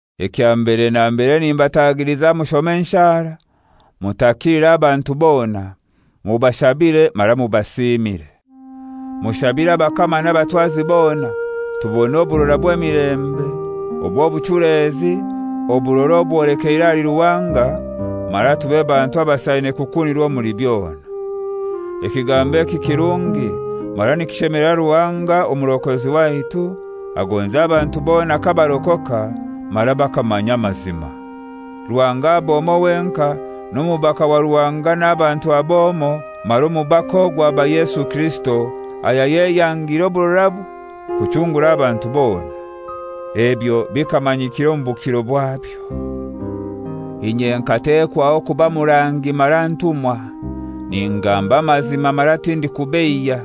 Ekya mbere na mbere nimbatagiliza mushome enshara mutakilire abantu bona, mubashabire mara mubasiimire. Mushabire abakama n'abatwazi bona tubone oburora bw'emilembe, obw'obuchulezi, oburora obwolekeire ahali Ruhanga, mara tube bantu abasaine kukunirwa omuli byona. Ekigambo eki kirungi, mara nikishemelera Ruhanga Omurokozi waitu, agonza abantu bona kabarokoka mara bakamanya amazima. Ruhanga ab'omoi wenkai, n'omubaka wa Ruhanga n'abantu ab'omoi, mara omubaka ogwo aba Yesu Kirisito, ayayeyangire oburorabwe kuchungura abantu bona. Ebyo bikamanyikira omu bukiro bwabyo. Inye nkatewaho kuba murangi mara ntumwa (ningamba amazima mara tindikubeiya),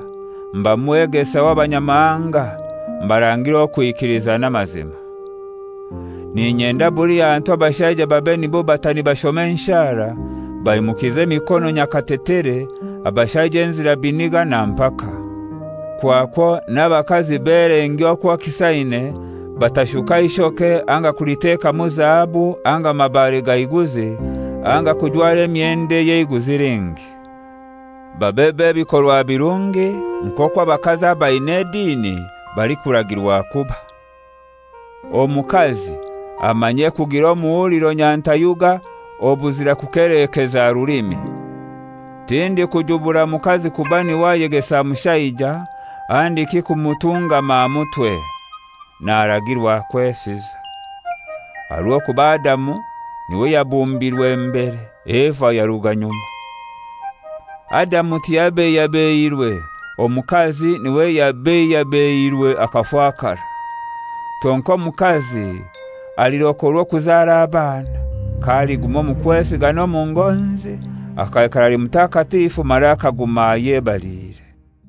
mba mwegesa w'Abanyamahanga, mbarangire okwikiliza n'amazima. N'inyenda buli hantu abashaija babe nibo bata nibashoma enshara, baimukize emikono nyakatetere, abashaija enzira biniga na mpaka. Kwakwo n'abakazi belengye okwo kisaine, batashuka ishoke anga kulitekamu zahabu anga mabare ga iguzi anga kujwara emyendo ey'eiguzi lingi. Babe b'ebikorwa birungi nk'okwo abakazi abain'edini balikuragirwa kuba. Omukazi amanye kugira omuhuliro nyantayuga obuzira kukeleekeza rulimi. Tindikujubura mukazi kuba niwe ayegesa mushaija handiki kumutungama aha mutwe. Naragirwa kwesiza. Aha rw'okuba Adamu niwe yabumbirwe mbere, Eva yaruga nyuma. Adamu tiyabeihyabeihirwe; omukazi niwe yabeihyabeihirwe akafakara. Kyonkai omukazi alirokorwa okuzara abana, k'aliguma omu kwesiga n'omu ngonzi akaikara ali mutakatifu mara akaguma ayebaliire.